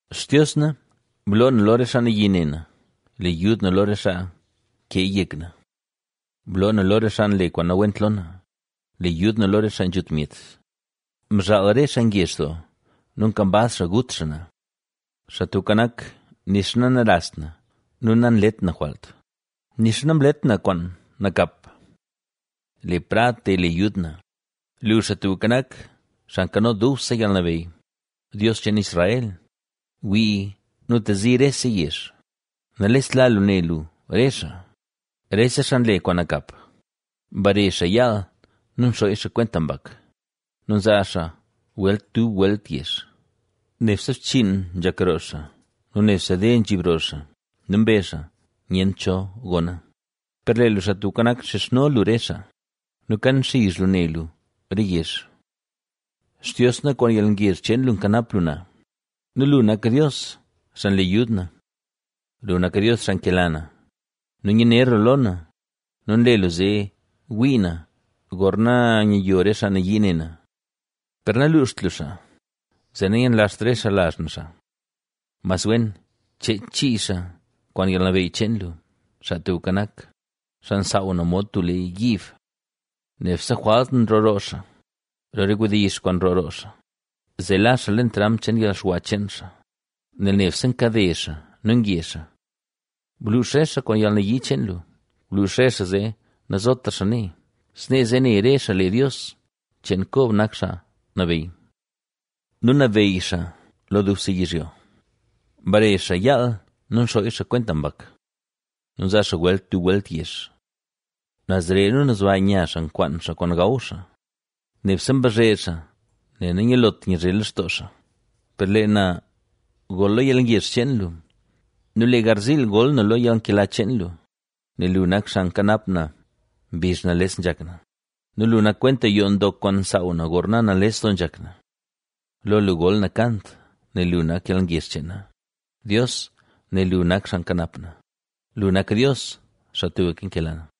Xtios na, bloo na lo re xaa nayii ne na; le yud na lo re xaa keeya yek na. Bloo na lo re xaa nle kwaan nawent lo na, le yud na lo re xaa nzhut myet. Mzhaal re xaa ngezh doo nu kambaz xaa gut xaa na. Xaa Tubka Nak, nixa nanarast na nu nanlet na jwalt; nixa namlet na kwaan nakap. ¡Ble prad, te le yud na! Lu, Xaa Tubka Nak, Xaa Nkano Dubse Yalnabeyy; Dios cheen Israel, wii nu tezi rese yezh, nalestla lu ne lu re xaa, rese xaa nle kwaan nakap. Mbare xaa yaal nu nxooy xaa kwenta mbak nu nzaa xaa welt dub welt yezh. Nebse bchiin nzhak roo xaa nu nebse de nzhiib roo xaa nu mbezh xaa: “Nyent cho gona.” Per lee lu, Xaa Tubka Nak, nxizhno lu re xaa nu kan nxizh lu ne lu re yezh. Xtios na, kwaan yalngezh cheen lu nkanap lu na nu lu nak Dios xaa nle yud na. Lu nak Dios xaa nkela na, nu nyaner lu lo na nu nle lu zee wii na, gorna nyayo re xaa nayii ne na. Per naluuxt lu xaa, zee nayenlazht re xaa lazh na xaa; mas wen cheech chii xaa kwaan yalnabeyy cheen lu, Xaa Tubka Nak, xaa nsaaw na mod tub lee yiib. Nebse jwalt nroo roo xaa, lo re wdizh kwaan nroo roo xaa, zee la xaa leen tramp cheen yalxwa cheen xaa, nel nebse nkade xaa nu nge xaa. Bluux re xaa kwaan yalnayii cheen lu, bluux re xaa zee nazotra xaa nee; snee zee ne re xaa lee Dios cheen Kob nak xaa nabeyy nu nabeyy xaa lo dubse yizhyo. Mbare xaa yaal nu nxooy xaa kwenta mbak nu nzaa xaa welt dub welt yezh. Nazre nu nazba nya xaa nkwaan xaa kwaan gaw xaa; nebse mbazhe xaa, nel nanyalot nyazhe lextoo xaa. Per lee na gol lo yalngezh cheen lu nu lee garziil gol na lo yalnkela cheen lu, nel lu nak xaa nkanap na mbizh nales nzhak na nu lu nak kwenta yoo ndok kwaan nsaaw na, gorna nales doo nzhak na. Lo lu gol na kant, nel lu nak yalngezh cheen na, Dios, nel lu nak xaa nkanap na, lu nak Dios, xaa tubka nkela na.